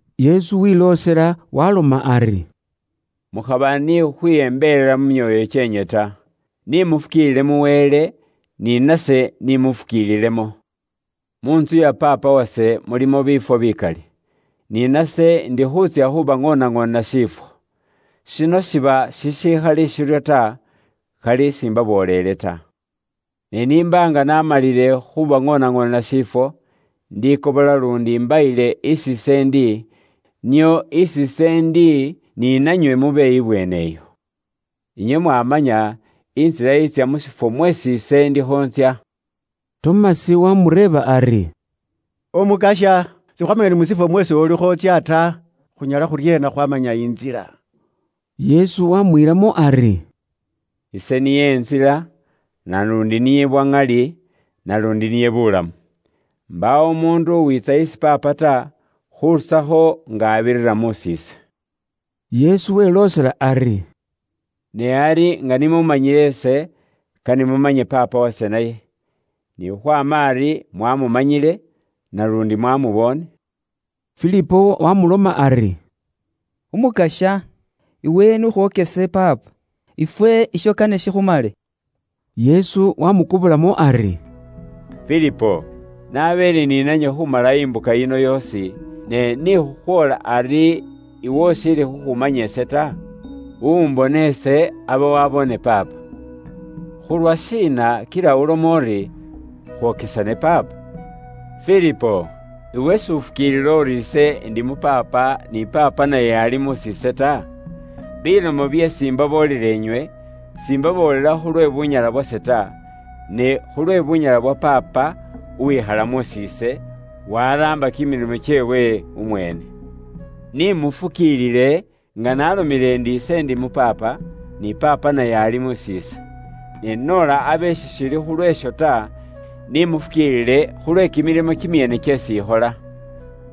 Yesu wiloosela waaloma ari, “Mukhaba ni khukhwiyembelela mu myoyo kyeenywe ta. Ni mufukiilile mu Wele, ni nase ni mufukiililemo. Muntsu ya Paapa wase mulimo biifwo bikali. Ni nase ndi khuutsya khubaŋoonaŋoonela shifwo. Shino shiba shishikhali shiryo ta, khali ise s'imbaboolele inywe ta. Ne n'imba nga namalile khubaŋoonaŋoonela shifwo, indikobola luundi imbayile isi ise ndi, nio isi ise ndi ni nanywe mube ibweene iyo. Inywe mwamanya intsila itsya mu shifwo mweesi ise ndikho ntsya.” Tomasi waamureeba ari, “Umukasya, sikhwaamanyile ni mu shifwo mweesi ulikho wutsya ta, khunyala khuryeena khwaamanya intsila?” Yesu waamwiilamo ari, “Ise niye intsila, naluundi niye bwa ŋali, naluundi niye buulamu. Mbaawo umuundu uwiitsa isi Paapa ta, khurusakho nga abirira mus'iise.” Yesu weloosela ari, “Ne ari nga ni muumanyile ise, kane mumanye Paapa wase naye. Ni khukhwaama ari mwamumanyile, naluundi mwamuboone.” Filipo waamuloma ari, “Umukasya, iwe n'ukhwokese Paapa, ifwe isho kane shikhumale.” Yesu waamukobolamo ari, “Filipo, nabeele ni nanywe khumala imbuka yino yoosi, ne ni khukhwoola ari iwe ushiili khukhumanya ise ta? Uwumbona ise, aba waboone Paapa, khulwashiina kila uloma uri khwokesane Paapa? Filipo, iwe s'ufukiilila uri ise ndi mu Paapa, ni Paapa naye ali mus'iise ta? Bilomo byeesi imbaboolela inywe, simbaboolela khulwe bunyala bubwase ta; ne khulwe bunyala bwa Paapa uwikhala mus'iise, waraamba kimilimo kyeewe umweene. Ni mufukiilile nga naalomile ndi ise ndi mu Paapa, ni Paapa naye ali mus'iise. Ne noola abe sishili khulwe isho ta, ni mufukiilile khulwe kimilimo kimyeene kyeesi ikhola.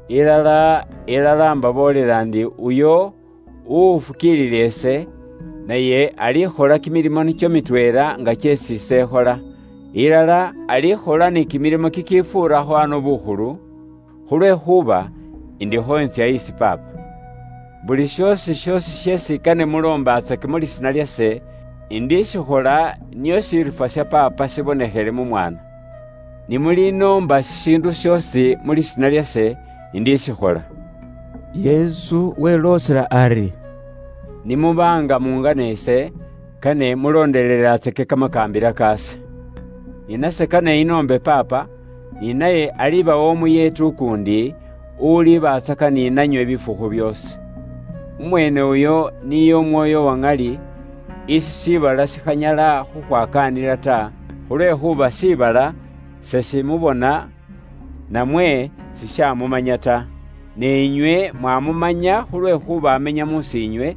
Ilala, ilala, imbaboolela ndi uyo uwufukiilila ise, naye alikhola kimilimo nikyo mitweela nga kyeesi ise ikhola, ilala alikhola ni kimilimo kikifuurakho ano bukhulu, khulwekhuuba indikho intsya isi Paapa. Buli shoosi shoosi sheesi kane muloombatsake mu lisiina lyase, indishikhola, nio shiriifwa sha Paapa shibonekhele mu Mwaana. Ni mulinoomba shishiindu shoosi mu lisiina lyase, indishikhola.” Yesu weloosela ari, “Ni muba nga mungana ise, kane mulondelelatsake kamakaambila kaase. Ni nase kane inoombe Paapa, ni naye alibawa Umuyeeti ukuundi, ulibatsaka ni nanywe bifukhu byoosi. Umweene uyo niye Umwoyo uwa ŋali, isi shiibala shikhanyala khukhwakaanila ta, khulwekhuuba shiibala seshimubona namwe sishamumanya ta. Ne inywe mwamumanya khulwekhuuba amenya mus'iinywe,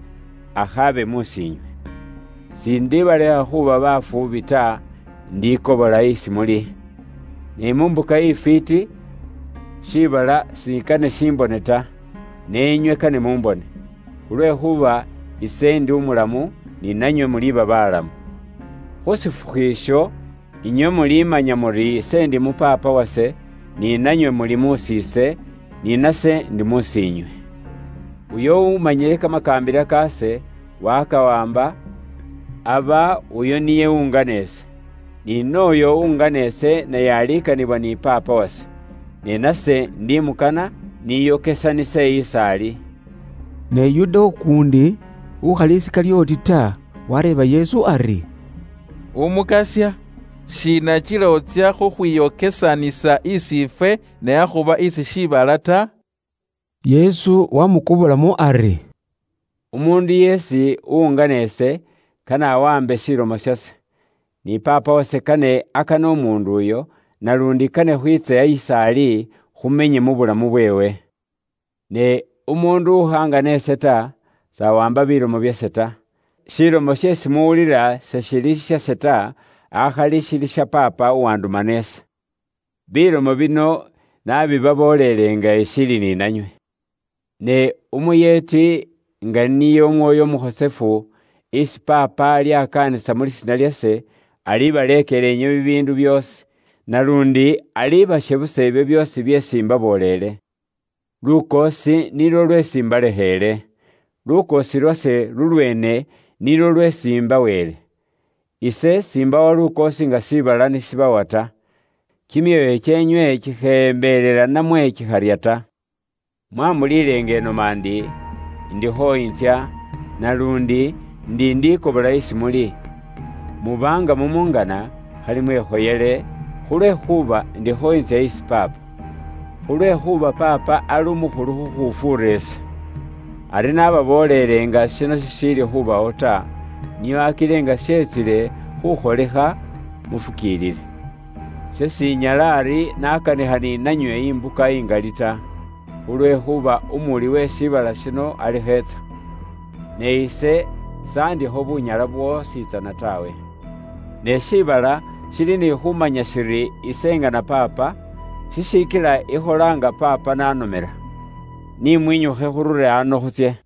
akhaabe mus'iinywe. “Ise s'indibalekha inywe khuuba bafuubi ta; indikobola isi muli. Ne mu mbuka ifwiiti, shiibala sikane shimbone ta, ne inywe kane mumbone. Khulwekhuuba ise ndi umulamu, ni nanywe muliba balamu. Khu shifukhu isho, inywe mulimanya muri ise ndi mu Paapa wase, ni nanywe muli mus'iise, ni nase ndi mus'iinywe. Uyo umanyile kamakaambila kaase, wakawaamba, aba uyo niye uwungana ise. Ni n'oyo uwungana ise, naye alikanibwa ni Paapa wase. Ni nase ndi mukana, niyokesanise is'ali.” Ne Yuda ukuundi, ukhali Isikalyoti ta, wareeba Yesu ari, “Umukasya, shiina kila wutsya khukhwiyokesanisa isi ifwe, ne akhuba isi shiibala ta?” Yesu waamukobolamo ari, “Umuundu yeesi uwungana ise, kane awaambe shilomo shase. Ni Paapa wase kane akane umuundu uyo, naluundi kane khwiitse is'ali, khumenye mu bulamu bweewe. Ne umuundu ukhangana ise ta, s'awaamba bilomo byase ta. Shilomo sheesi muwulila seshili shishase ta, akhali shili sha Paapa uwandumana ise. “Bilomo bino nabibabooleele nga ishiili ni nanywe. Ne Umuyeeti, nga niye Umwoyo Umukhosefu, isi Paapa alyakaanisa mu lisiina lyase, alibaleekela inywe bibiindu byoosi. Naluundi alibashebusa ibyo byoosi byeesi imbabooleele. Lukoosi nilwo lweesi imbalekheele; lukoosi lwase lulweene nilwo lweesi imbaweele. Ise s'imbawa lukoosi nga shiibala ni shibawa ta. Kimyoyo kyeenywe kikheyembelela namwe kikharya ta. Mwambulile nga noma ndi, ‘Indikho intsya, naluundi ndi indikobola isi muli.’ Muba nga mumungana, khali mwekhoyele, khulwekhuuba indikho ntsya isi Paapa. Khulwekhuuba Paapa ali umukhulu khukhufuura ise. Ari nababooleele nga shino shishiili khubawo ta, nio akile nga shetsile khukholikha, mufukiilile. Ise shinyala ari nakanikha ni nanywe imbuka ingali ta, khulwekhuuba umuwuli uwe shiibala shino alikho etsa. Ne ise s'andikho bunyala bwoositsana taawe. Ne shiibala shili ni khumanya shili ise ingana Paapa, shishikila ikhola nga Paapa n'anomela. Ni mwinyukhe khurure ano khutsye.”